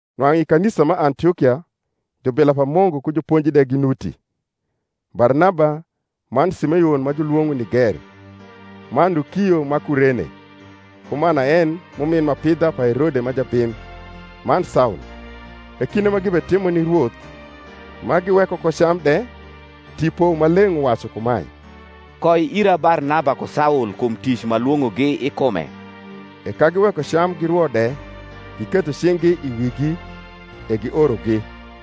Nwang’u i kanisa ma Antiokia, jubila pa Mungu ku juponji de ginuti, Barnaba, man Simeon ma julwong’o Niger, man Lukio ma Kurene, ku Manaen m’umin m’apidha pa Herode ma jabim, man Saul. E kinde ma gibetimo ni Rwoth, ma giweko ko cam de, Tipo Maleng’ uwacu kumae, Koi ira Barnaba ku Saul kum tic m’alwong’ogi i kume. E ka giweko cam girwo de giketho cing’gi i wigi, e giorogi.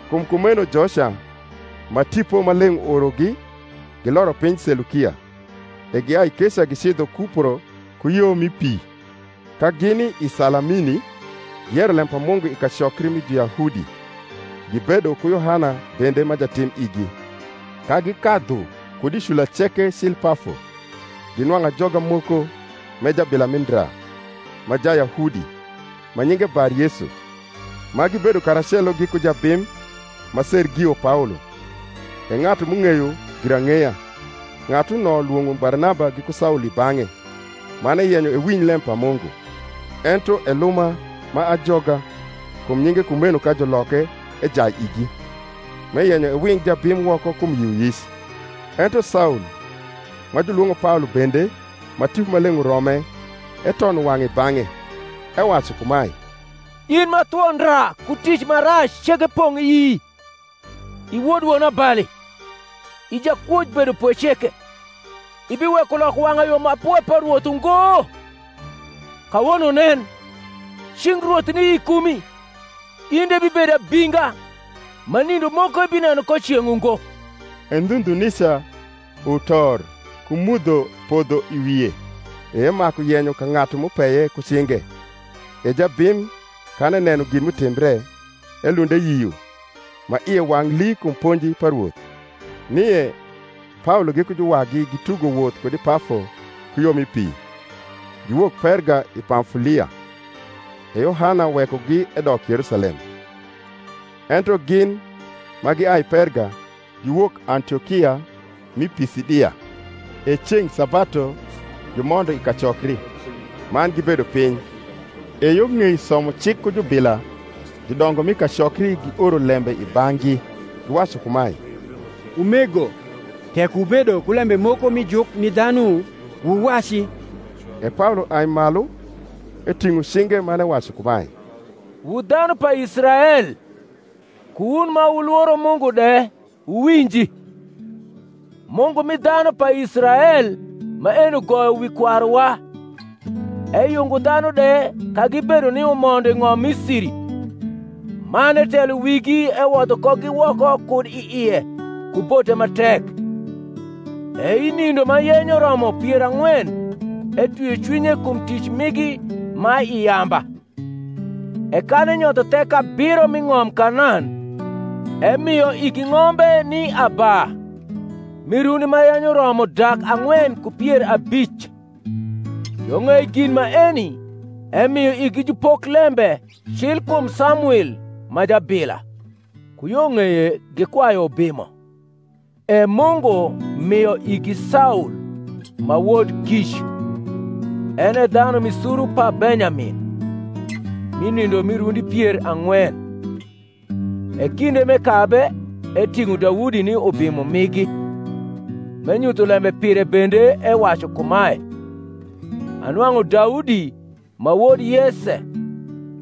Kum kumeno joca, ma Tipo Maleng’ uorogi, giloro piny Selukia; e giai keca gicidho Kupro ku yo mi pi. Ka gini i Salamini, giyero lem pa Mungu i kacokri mi Juyahudi: gibedo ku Yohana bende ma jatim igi. Ka gikadhu kud i cula ceke cil Pafo, ginwang’u ajoga moko, m’e jabila mi ndra, ma Jayahudi, ma nyinge BarYesu; ma gibedo karacelo giku jabim, ma Sergio Paolo, e ng’atu m’ung’eyo girang’eya. Ng’atuno lwong’o Barnaba giku Saul i bang’e, man eyenyo ewinj lem pa Mungu. Ento Eluma ma ajoga (kum nyinge kumeno ka juloke) ejai igi, m’eyenyo ewing jabim woko kum yioyic. Ento Saul, ma julwong’o Paolo bende, ma Tipo Maleng’ urome, etono wang’e i bang’e, ewacu kumae, In ma thwo ndra ku tic ma rac ceke pong’ ii, i wod wonabali, i jakwoj bedopwe ceke, ibiweko loko wang’ayo ma pwe pa Rwoth ungo? Kawono, nen, cing’ Rwoth ni i kumi, in de ibibedo abinga, ma nindo moko ibineno ko ceng’ ungo. E ndhu ndhu nica utor ku mudho podho i wie; e emaku yenyo ka ng’atu m’upeye ku cinge. E jabim, kan eneno gin m’utimbre, elund eyio, ma ie wang’ lii kum ponji pa Rwoth. Nie, Paolo giku juwagi gitugo woth kud i Pafo ku yo mi pi, giwok Perga i Pamfulia: e Yohana wekogi edok Yerusalem. Ento gin, ma giai Perga, giwok Antiokia m’i Pisidia; e ceng’ sabatu gimondo i kacokri, man gibedo piny. E yo ng’ei somo cik ku jubila judongo mi kacokri gioro lembe i bang’gi, giwacu kumae, Umego, tek wubedo ku lembe moko mi juk ni dhanu, wuwaci. E Paolo ai malu, eting’o cinge man ewacu kumae: Wu dhanu pa Israel, ku wun ma wulworo Mungu de, wuwinji. Mungu mi dhanu pa Israel maeni ugoyo wi kwaruwa, eyungo dhanu de ka gibedo ni umondo i ng’om Misiri, man etelo wigi ewodho kogi woko kud i ie ku bote ma tek. E i nindo ma yenyo romo pier ang’wen etwio cwinye kum tic migi ma i yamba. E kan enyotho thek abiro m’i ng’om Kanan, emio igi ng’ombe ni aba, mi rundi ma yenyo romo dak ang’wen ku pier abic: yo ng’ei gin maeni emio igi jupoklembe cil kum Samwil ma jabila. Ku yo ng’eye gikwayu ubimo: e Mungu mio igi Saul ma wod Kic, en e dhanu mi suru pa Benyamin, mi nindo mi rundi pier ang’wen. E kinde m’ekabe, eting’o Daudi ni ubimo migi; m’enyutho lembe pire bende ewacu kumae, Anwang’u Daudi ma wod Yese,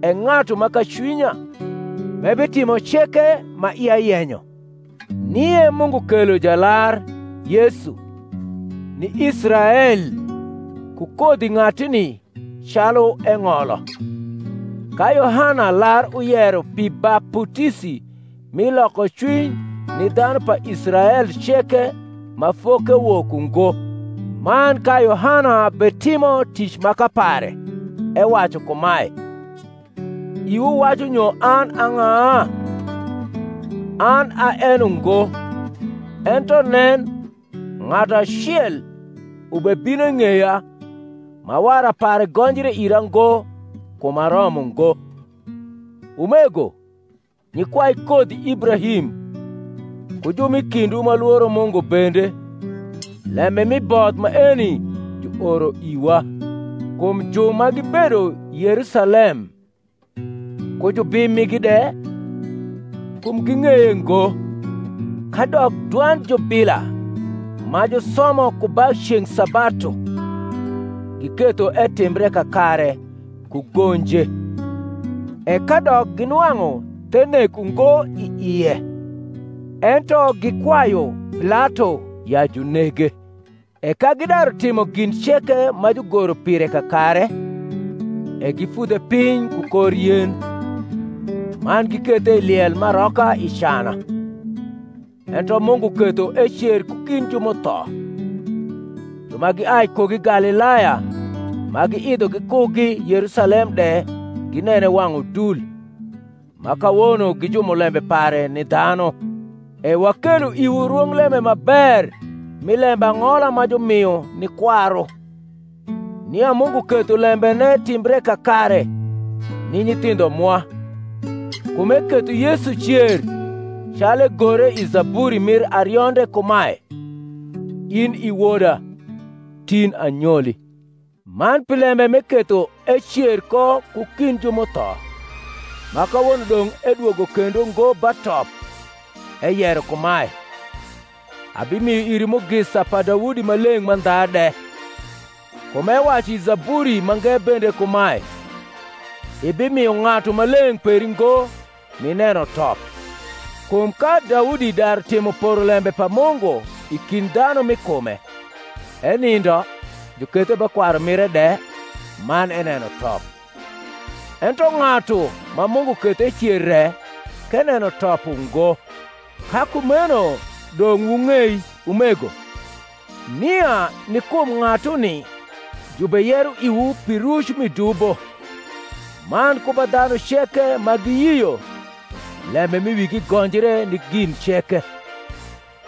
e ng’atu ma ka cwinya, m’ebitimo ceke ma ia yenyo. Nie Mungu kelo Jalar, Yesu, ni Israel ku kodhi ng’atuni calu eng’olo; ka Yohana lar uyero pi baputisi mi lokocwiny ni dhanu pa Israel ceke ma fokewok ungo. Man ka Yohana betimo tic maka pare, ewacu kumae, Iwu wacu nyo an a ng’a? An a en ungo. Ento nen, ng’atu acel ubebino i ng’eya ma wara pare gonjre ira ngo kum aromo ngo. Umego, nyikwai kodhi Ibrahim, ku ju m’i kindwu ma lworo Mungu bende, lembe mi both maeni juoro iwa. Kum ju ma gibedo Yerusalem, ku jubim migi de, kum ging’eye ngo, kadok dwand jubila ma jusomo ku ba ceng’ sabatu, giketho etimbre kakare ku gonje. E kadok ginwang’u the nek ungo i ie, ento gikwayu Pilato ya junege. E ka gidaru timo gin ceke ma jugoro pire kakare, e gifudhe piny ku kor yen, man gikethe i liel m’aroka i cana. Ento Mungu ketho ecer ku kind ju m’utho: ju ma giai kugi Galilaya ma giidho gikugi Yerusalem de ginene wang’ udul, ma kawono gi jumulembe pare ni dhanu. E wakelo iwu rwonglembe ma ber mi lembang’ola ma jumio ni kwaru, nia Mungu ketho lembene timbre kakare ni nyithindho mwa, kum eketho Yesu cer; calu egore i zaburi mir arionde kumae, In i Woda, tin anyoli. Man pi lembe m’eketho ecer ko ku kind ju m’utho, ma kawono dong’ edwogo kendo ngo ba top, eyero kumae, Abimio iri mugisa pa Daudi ma leng’ mandha de. Kum ewacu i zaburi mange bende kumae, Ibimio Ng’atu Maleng’ peri ngo nineno top. Kum ka Daudi daru timo porolembe pa Mungu i kind dhanu m’i kume, enindo, jukethe ba kwaru mire de, man eneno top: ento ng’atu ma Mungu ketho ecer re k’eneno top ungo. Ka kumeno dong’ wung’ei, umego, nia ni kum ng’atuni jubeyero iwu pi ruc mi dubo: man ku ba dhanu ceke ma giyio, lembe m’i wigi gonjre ni gin ceke,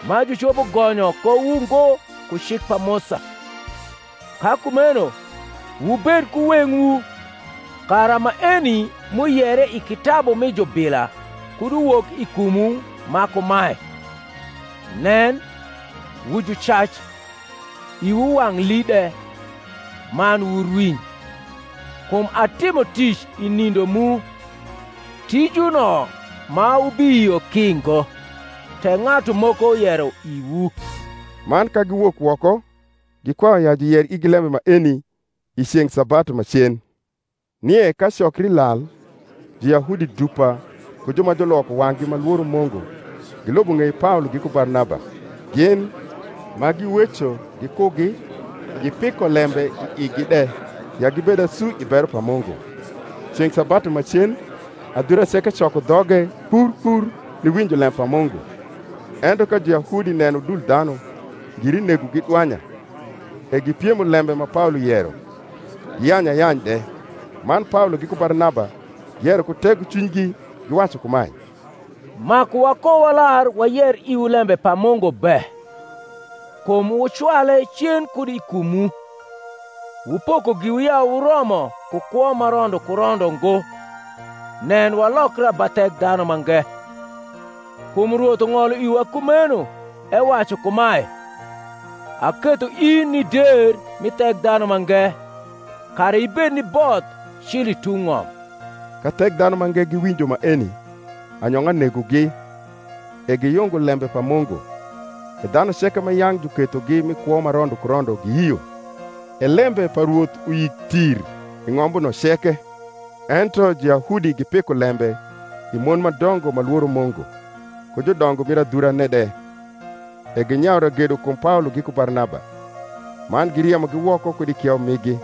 ma jucopo gonyo kowu ngo ku cik pa Musa. Ka kumeno, wubed ku weng’wu, kara maeni m’uyere i kitabu mi jubila kud uwok i kumwu ma kumae: Nen, wu jucac, iwu wang’ lii de, man wurwiny; Kum atimo tic i nindo mu, Tijuno ma wubiyio ki ngo, tek ng’atu moko yero iwu. Man ka giwok woko, gikwayu ya juyer igi lembe maeni i ceng’ sabatu ma cen. Nie ka cokri lal, Juyahudi dupa ku ju ma juloko wang’gi ma lworo Mungu gilubo ng’ei Paolo giku Barnaba; gin, ma giweco gikugi, gipiko lembe i igi de ya gibed asu i bero pa Mungu. Ceng’ sabatu ma cen adhura ceke coko dhoge kpr kpr niwinjo lem pa Mungu. Ento ka Juyahudi neno udul dhanu, ngiri negogi dwanya, e gipiemo lembe ma Paolo yero, giyanyu ayany de. Man Paolo giku Barnaba giyero ku tegocwinygi, giwacu kumae, Maku wakowalar wayer iwu lembe pa Mungu be. Kum wucwale cen kud i kumwu, wupoko giwu ya wuromo ku kwo ma rondo ku rondo ngo, nen, walokra ba Thekdhanumange. Kum Rwoth ung’olo iwa kumeno, ewacu kumae, Aketho in ni der mi Thekdhanumange, Kara ibed ni both cil i tung’ ng’om. Ka Thekdhanumange giwinjo maeni, anyong’a negogi, e giyungo lembe pa Mungu: e dhanu ceke ma yang’ jukethogi mi kwo ma rondo ku rondo giyio. E lembe pa Rwoth uyik tir i ng’ombuno ceke. Ento Juyahudi gipiko lembe i mon ma dongo ma lworo Mungu, ku judongo mir adhurane de, e ginyayu ragedo kum Paolo giku Barnaba, man giriemogi woko kud i kieu migi.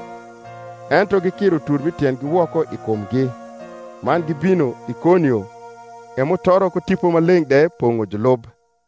Ento gikiro utur m’i tiendgi woko i kumgi, man gibino Ikonio. E mutoro ku Tipo Maleng’ de pong’o julub.